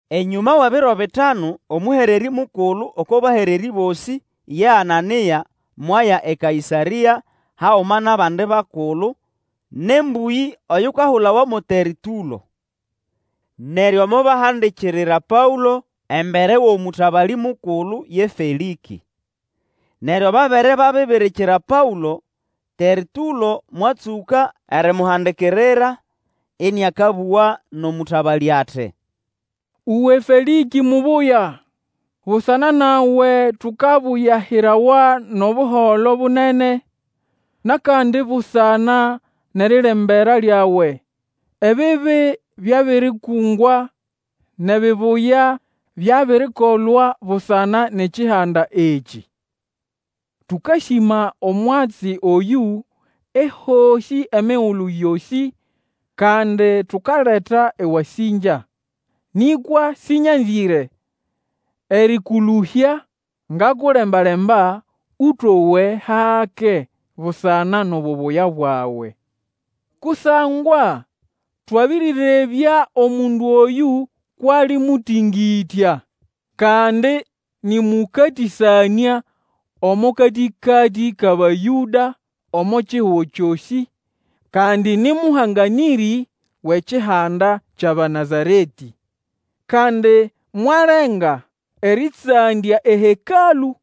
Enyũma wʼebiro bitanu, omũhererĩ mukulu oko bahererĩ bosĩ, ye Anania, mwaya eKaĩsarĩa haguma nʼabandi bakulu, nʼembũyĩ oyukahulawa mo Tertũlo. Neryo mobahandikirira Paũlo embere wʼomũtabalĩ mukulu ye Felĩkĩ. Neryo babere babibirikira Paũlo, Tertũlo mwatsũka erimuhandikirira, ĩnĩakabũga nʼomũtabalĩ ati, Uwe Felĩkĩ mubuya! Busana nawe tukabuyahirawa nʼobuholo bunene, nʼakandi busana nʼerilembera lyawe, ebibi byabirikungwa, nʼebibuya byabirikolwa busana nʼekihanda ekĩ. Tũkasĩma omwatsi oyũ ehosĩ emigulu yosĩ, kandi tukaleta ewasĩngya. Nĩkwa sĩnyanzĩre erĩkũlũhya, ngakulemba-lemba Ũtowe hake busana nʼobubuya bwawe. Kusangwa twabĩrĩrebya omundu oyũ kwʼali mũtĩngĩtya, kandi nĩ mũkatĩsanĩa omo katĩkatĩ kʼAbayũda omo kihugo kyosĩ, kandi nĩ mũhanganĩrĩ wʼekihanda kyʼAbanazaretĩ. Kandi mwalenga erĩtsandya eHekalũ,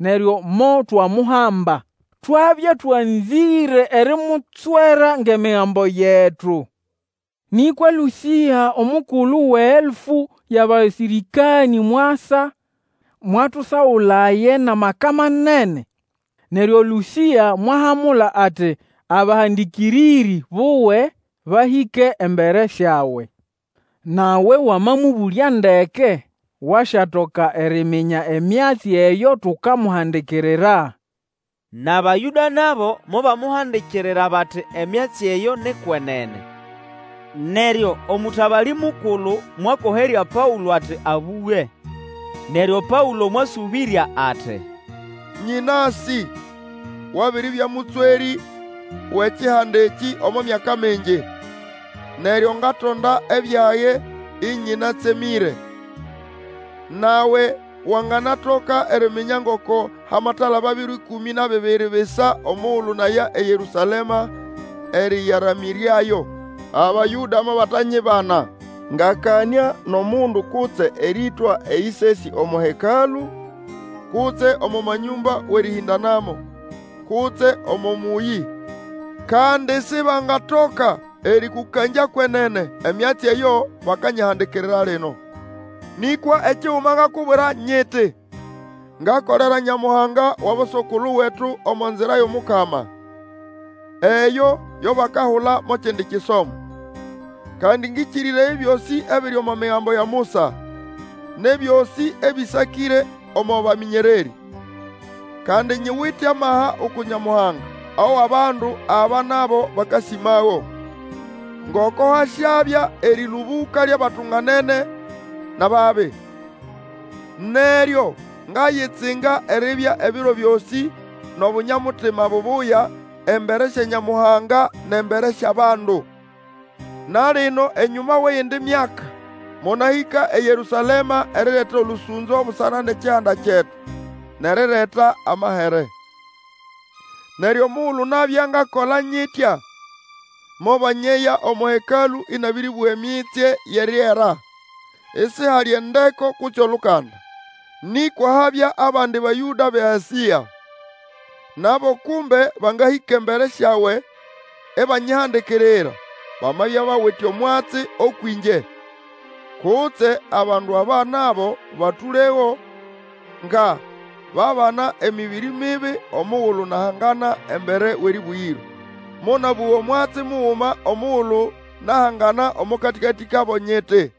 neryo motwamuhamba. [Twabya twanzĩre erimutswera ngʼEmigambo yetu. Nĩkwa Lũsĩa omukulu wʼeelfu yʼabasĩrĩkanĩ mwasa, mwatusagulaye nʼamaka manene. Neryo Lũsĩa mwahamula ati abahandĩkĩrĩrĩ buwe bahĩke embere syawe.] Nawe wamamũbũlya ndeke wasyatoka eriminya emyatsi eyo tukamuhandikirira. NʼAbayũda nabo mobamuhandikirira bati emyatsi eyo ni kwenene. Neryo omũtabalĩ mukulu mwakoherya Paũlo ati abũge. Neryo Paũlo mwasũbĩrya ati, Nyĩnasĩ wabiribya mũtswerĩ wʼekihanda ekĩ omo myaka mingi, neryo ngatonda ebyage ĩnyĩnatsemĩre. Nawe wanganatoka eriminya ngoko hamatalaba biro ĩkũmĩ na bibiri bisa omugulu naya eYerũsalema erĩyaramĩrĩayo. Abayũda mobatanyibana ngakanĩa nʼomundu kutse erĩtwa eyĩsesĩ omo Hekalũ, kutse omo manyũmba wʼerĩhĩndanamo, kutse omo mũyĩ. Kandi sibangatoka erĩkũkangya kwenene emyatsi eyo bakanyihandikirira lino. Nĩkwa ekiguma ngakubwira nyiti, ngakolera Nyamuhanga wʼaboso-kulu wetu omo Nzira yʼomukama, eyo yo bakahula mo kindi kisomo. Kandi ngĩkĩrĩraya ebyosĩ ebiri omo Migambo ya Musa, nʼebyosĩ ebĩsakĩre omo bamĩnyererĩ. Kandi nyiwite amaha uku Nyamuhanga, awʼabandu aba nabo bakasĩmago, ngoko hasyabya erĩlũbũka lyʼabatunganene nʼababi. Neryo ngayitsinga eribya ebiro byosĩ nʼobunya-mutima bubuya, embere sya Nyamuhanga, nʼembere syʼabandu. Na lino enyũma wʼeyindi myaka, monahĩka eYerũsalema erireta olũsũnzo busana nʼekihanda kyetu, nʼerireta amahere. Neryo omugulu nabya ngakola nyitya mobanyeya omo Hekalũ inabiribuga emitsye yʼeriera, isihali endeko kutse olukanda. Nĩkwa habya abandi Bayũda bʼeAsĩa, nabo kumbe bangahĩka embere syawe ibanyihandikirira, bamabya bawite omwatsi ũkwʼingye. Kutse abandu aba nabo batũlego nga babana emĩbĩrĩ mibi omugulu nahangana embere wʼErĩbũgĩro. Monabũga omwatsi muguma omugulu nahangana omo katĩkatĩ kabo, nyiti,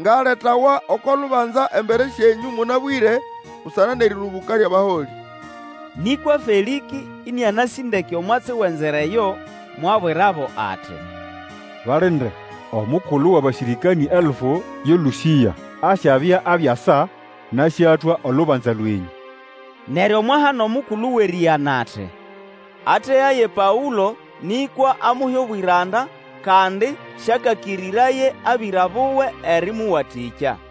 Ngaletawa oko lubanza embere syenyũ mũnabwĩre busana nʼerĩlũbũka lyʼabaholĩ. Nĩkwa Felĩkĩ, ĩnĩanasĩ ndeke omwatsi wʼeNzira eyo, mwabwirabo ati, balinde, Omukulu wʼabasĩrĩkanĩ elfu ye Lũsĩa, asyabya abiasa, nasyatwa olubanza lwenyũ. Neryo mwahana omukulu wʼerĩgana ati, ategaye Paũlo, nĩkwa amuhe obwĩranda, kandi syakakĩrĩraye abĩra buwe erĩmũwatĩkya.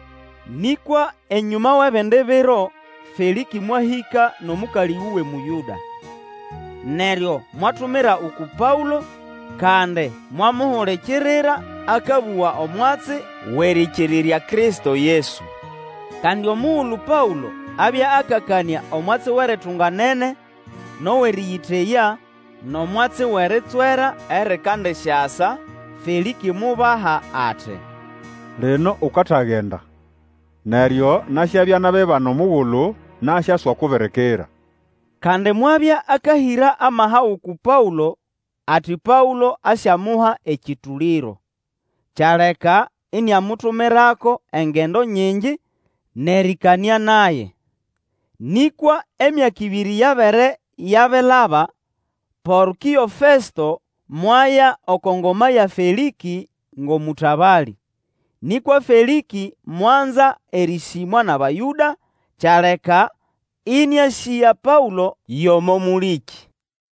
Nĩkwa enyũma wʼebindi biro, Felĩkĩ mwahĩka nʼomũkalĩ wuwe Mũyũda. Neryo mwatumira uku Paũlo, kandi mwamuhulikirira akabũga omwatsi wʼerĩkĩrĩrya Kristo Yesu. Kandi omugulu Paũlo abya akakanĩa omwatsi wʼeritunganene nʼowʼerĩyĩteya, nʼomwatsi wʼeritswera erikandisyasa, Felĩkĩ mubaha ati, Lino ukatagenda, neryo nasyabya nabibana omugulu nasyaswakubirikira. Kandi mwabya akahĩra amaha uku Paũlo, ati Paũlo asyamuha ekyũtũlĩro. Kyaleka iniamutumirako engendo nyingi, nʼerĩkanĩa naye. Nĩkwa emyaka ĩbĩrĩ yabere yabilaba, Porkĩo Festo mwaya oko ngoma ya Felĩkĩ ngʼomũtabalĩ. Nĩkwa Felĩkĩ mwanza erĩsĩmwa nʼAbayũda, kyaleka ĩnĩasĩga Paũlo yʼomo mũlĩkĩ.